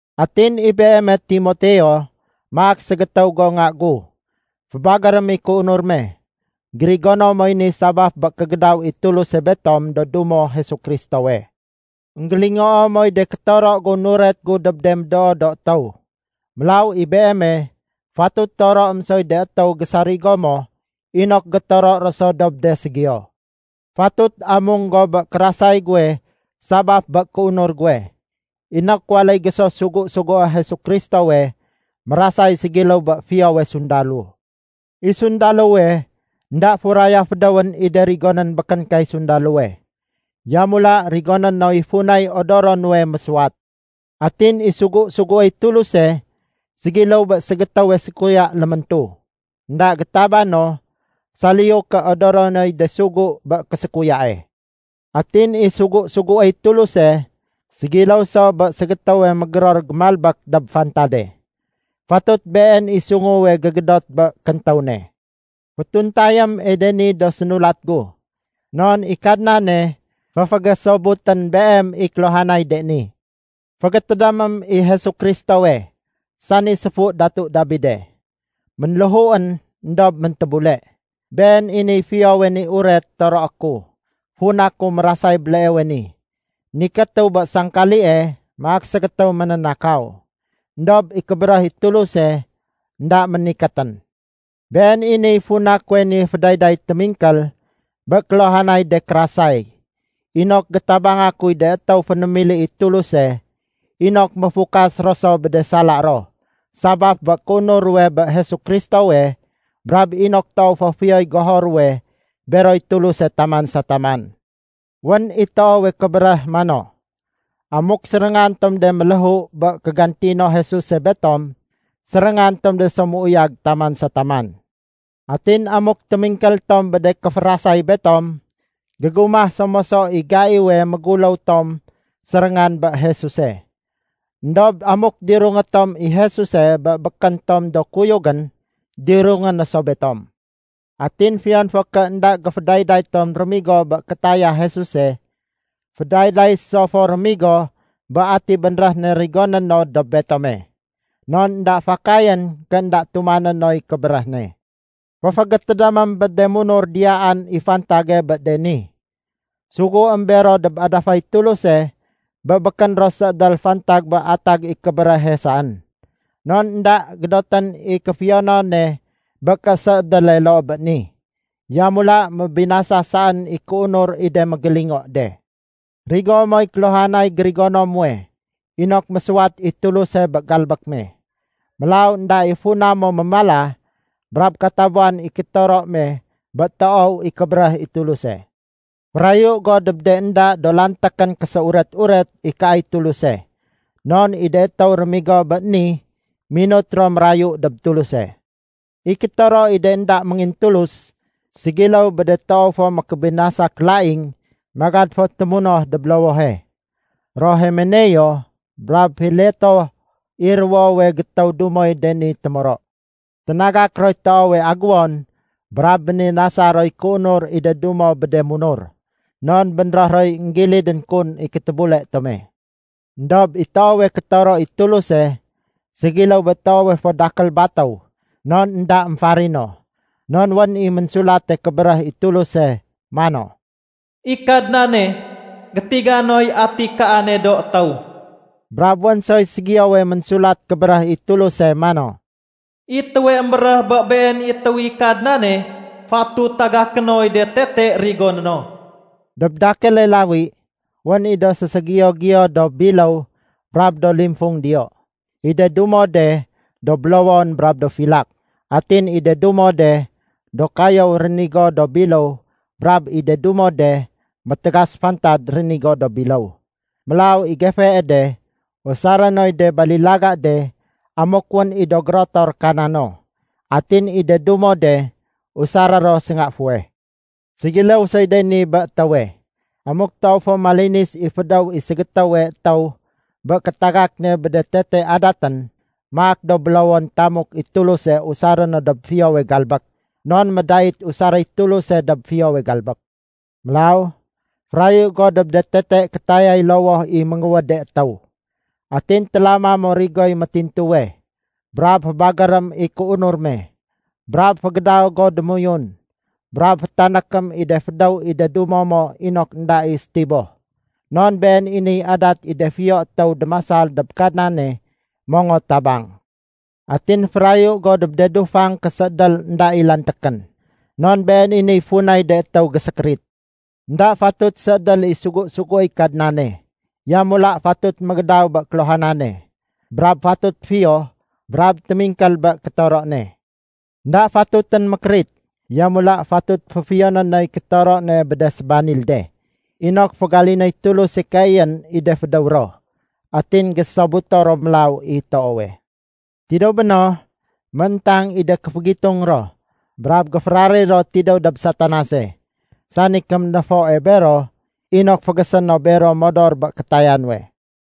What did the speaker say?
Atin i beeme Timoteo, maak ségétéw go nga gu, fébagérém i kéunur me. Gérigono moy ni sabaf bé kégédaw i Tuluse betom do dumo Jesu Kristowe. Enggélingoo moy de kétoro gu nuret gu dob de médoo do étéw. Mélaw i beeme, fatut toroém soy de étéw gésarigo mo inok gétoro ro so dob de ségiyo. Fatut amung go bé kérasay guwe sabaf bé kéunur guwe, inok waléy go so sugu-sugué Jesu Kristowe mérasay ségiléw bé fiyowe sundalo. I sundalowe énda furaya fédéwén i de rigonén békén kay sundalowe. Yamula rigoné noy funay odoro nuwe mésuwat. Atin i sugu-suguéy Tuluse ségiléw bé ségétéwe sékuya léméntu. Enda gétaba no saliyu ké odoro noy de sugu bé késékuyae. Atin i sugu-suguéy Tuluse ségiléw so bé ségétéwe mégéror gémalbék dob fantade. Fatut been i sunguwe gégédot bé kéntéw ne. Fétuntayém i de ni do sénulat gu, non i Kadnane féfégésobutén beem i kéluhanay de ni. Fégétédémém i Jesu Kristowe, sani séfu Datu Dabide. Ménléhuén, éndob méntébule. Been i niy Fiyowe ni Uret toroé ku, funa ku mérasay béleewe ni, nikétu bé sangkalie maak ségétéw ménénakaw. Endob i kébéréh i Tuluse énda ménikétén! Been i niy funa kuwe ni fédayday témingkél bé kéluhanay de kérasay, inok gétabanga kuy de étéw fénémili i Tuluse, inok méfukas ro so bé de sala ro sabaf bé kéunur ruwe bé Jesu Kristowe brab inok toow fo fiyoy goho ruwe beroy Tuluse taman sa taman. Wén i toowe kébéréh mano, “Amuk séréngan tom de méléhu bé kégantino Jesuse betom, séréngan tom de so méuyag taman sa taman. Atin amuk témingkél tom bé de kéférasay betom, gégumah so moso i gaiwe méguléw tom séréngan bé Jesuse. Endob amuk dirungé tom i Jesuse bé békén tom do kuyugén, dirungé no so betom. Atin fiyon fo ké énda géfédayday tom rémigo bé kétaya Jesuse, fédayday so fo rémigo bé ati bénréh ne rigoné no dob betome. Non énda fakayén ké énda tumané noy kébéréh ne.” Féfégétédémém bé de munur diyaan i fantage bé de ni. Suguém bero dob adafay Tuluse bé békén ro séédél fantag bé atag i kébéréhe saén. Non énda gédotén i kéfiyonone bé késéédéle loo bé ni, yamula mébinasa saén i kéunur i de mégélingo de. Rigo moy kéluhanay gérigono muwe inok mésuwat i Tuluse bé galbék me. Mélaw énda i funa mo mémala brab katabuwan i kétoro me bé toow i kébéréh i Tuluse. Férayu go dob de énda do lantékén késéuret-uret ikaay Tuluse, non i de étéw rémigo bé ni minut ro mérayu dob Tuluse. I kétoro i de énda méngintulus, ségiléw bé de toow fo mékébinasa kélaing magad fo témunoh dob lowohe. Ro Himeneo brab Fileto i ruwowe gétéw dumoy de ni témoro. Ténagak roy toowe aguwon brab béninasa roy kéunur i de dumo bé de munur. Non bénréh roy énggilidén kun i kétébule tome. Endob i toowe kétoro i Tuluse ségiléw bé toowe fo dakél batéw non énda émfarino. Non wén i Ménsulate Kébéréh i Tuluse mano, “I Kadnane, gétiga noy ati kaane do étéw.” Brab wén soy ségiyowe Ménsulat Kébéréh i Tuluse mano, “I étéwe émbéréh bé been i étéw i Kadnane, fatut tagaké noy de tete rigoné no.” Dob dakéle lawi, wén i do séségiyo-ségiyo do biléw brab do limfung diyo. I de dumo de do bélowon brab do filak. Atin i de dumo de do kayéw rénigo do biléw brab i de dumo de métégas fantad rénigo do biléw. Mélaw i gefee de, usaré noy de balilaga de amuk wén i do gérotor kana no. Atin i de dumo de usaré ro sénga fuweh. Ségiléw soy de ni bé étéwe. Amuk toow fo malinis i fédéw i ségétéwe étéw bé kétagak ne bé de tete adatén, maak do bélowon tamuk i Tuluse usaré no dob fiyowe galbék, non médait usaréy Tuluse dob fiyowe galbék. Mélaw, férayu go dob de tete kétayay lowoh i ménguwéde étéw. Atin télama mo rigoy métintuwe, brab fébagérém i kéunur me, brab fégédaw go démoyun, brab fétanékém i de fédéw i de dumo mo inok énda i sétiboh. Non been i niy adat i de fiyo étéw démasal dob Kadnane mongot tabang. Atin férayu go dob de dufang késéédél énda i lantékén. Non been i niy funay de étéw gésékérit. Enda fatut séédél i sugu-suguéy Kadnane. Yamula fatut mégédaw bé kéluhanane. Brab fatut fiyo brab témingkél bé kétoro ne. Enda fatutén mékérit, yamula fatut féfiyoné noy kétoro ne bé de sébanil de, inok fégalinéy Tuluse keeyén i de fédéw ro atin gésobuto ro mélaw i toowe. Tidéw béno, mééntang i de kéfégitung ro brab géféraréy ro tidéw dob Satanase, sani kéménéfoe bero inok fégésé no bero modor bé kétaya nuwe.